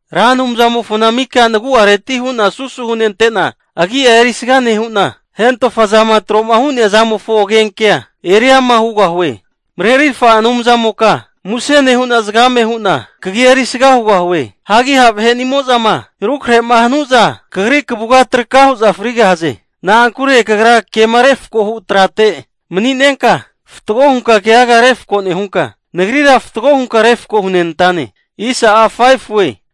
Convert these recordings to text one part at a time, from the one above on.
Ra Anumzamofona mika nagu'areti hu'na susu hunente'na agi'a erisga nehu'na, hentofa zama tro'ma hu'nea zamofo agenkea eri ama hugahue. Marerirfa Anumzamoka, muse nehu'na zagame hu'na kagia erisga hugahue. Hagi ha' vahe'nimo'zama rukrahe'ma hanu'za, kagri kavuga traka hu'za frigahaze. Na'ankure kagra kema refko hu trate mani'nenka fatgo hunka keaga refko nehunka, nagrira fatgo hunka refko hunenantane.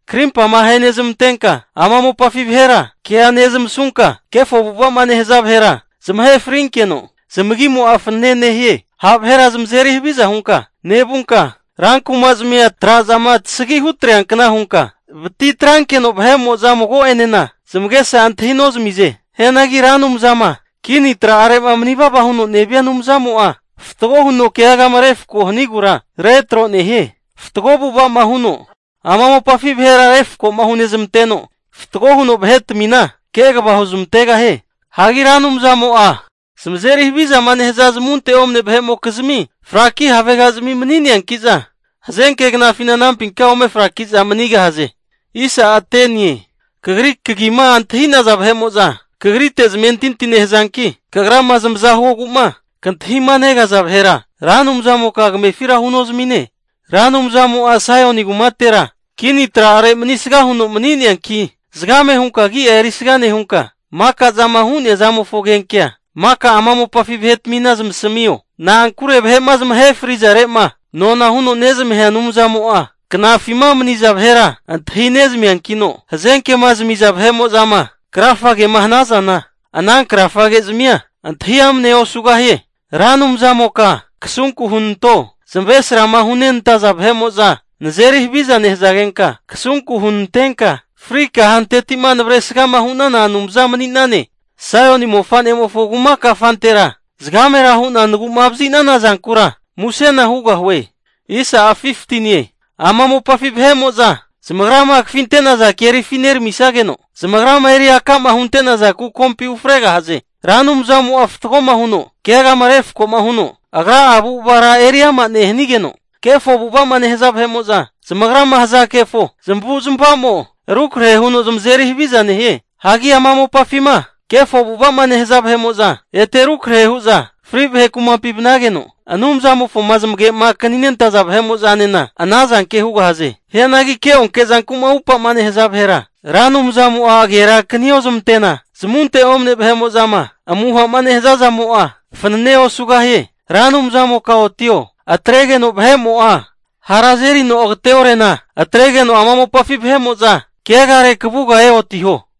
Krimpama ahenezmantenka ama mopafi vahera kea nezmasunka, kefo avu'ava'ma nehaza vahera zamahe frinkeno zamagimo'a fanene nehie. Ha' vahera zamazeri haviza hunka nevunka, rankumazmia tra'zama tasgi hutreankna hunka vatitrankeno vahe'mo'za mago'enena zamagesa antahi nozmize. Hianagi Ra Anumzama kini tra'are'ma manivava huno nevia Anumzamo'a, fatgo huno keagama refko hanigura retro nehie. Fatgo avu'ava huno ama mopafi vahera refko hunezmanteno, fatgo huno vahetmina kegava huzmantegahie. Hagi Ra Anumzamo'a zamazeri havizama nehaza zamunte omne vahe'mokizmi fraki havegazmi mani'neanki'za hazenke knafina anampinka ome frakiza manigahaze. Kagri kagima antahi'naza vahe'mo'za kagrite zamentinti nehazanki, kagrama zamaza huogu'ma kantahima negaza vahera, Ra Anumzamoka kamefira hunozamine. Ra Anumzamo'a Saioni kumatera (Jerusalemi) kini tra'are manisga huno mani'neanki, zagame hunka agi'a erisga nehunka, maka zama hu'nea zamofo agenkea maka ama mopafi vahetmina zamasamio. Na'ankure vahe'ma zamahe frizare'ma, nona huno nezamahea Anumzamo'a knafima maniza vahera antahi nezmiankino, hazenke'ma zamiza vahe'mo'zama krafagema hanazana, ana krafage zamia antahi amnea osugahie. Ra Anumzamoka kasunku hunanto, zamavaresrama hunenantaza vahe'mo'za nazeri haviza nehazagenka, kasunku hunantenka, fri kahanteti'ma navresgama hu'nana Anumza mani'nane. Saioni (Jerusalemi) mofa'nemofo kuma kafantera zagamera hu'na nagu'ma vazi'nana zankura musena hugahue. Ama mopafi vahe'mo'za zamagrama kafinte'naza kerifi neramisageno, zamagrama eri aka'ma hunte'naza kukompi ufregahaze. Ra Anumzamo'a fatgoma huno keagama refkoma huno, agra'a avu'avara eriama nehigeno, kefo avu'ava'ma nehaza vahe'mo'za zamagrama haza kefo zamavu'zmavazamo rukrahe huno zamazeri havizana nehie. Hagi ama mopafima kefo avu'ava'ma nehaza vahe'mo'za, ete rukrahe hu'za fri vahe kumapi vanageno, Anumzamofoma zamagema akaninentaza vahe'mo'zanena ana zanke hugahaze. Hianagi keonke zanku'ma upa'ma nehaza vahera, Ra Anumzamo'a agera akaniozmante'na, zamunte omne vahe'mo'zama amuhama nehaza zamo'a, fananea osugahie. Ra Anumzamoka otio! Atregeno vahe'mo'a hara azerino agate'orena, atregeno ama mopafi vahe'mo'za keagare kavuga eotiho.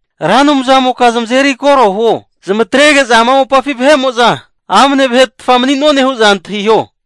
Ra Anumzamoka zamazeri koro huo! Zamatrege'za ama mopafi vahe'mo'za amne vahetafa mani'none hu'za antahiho.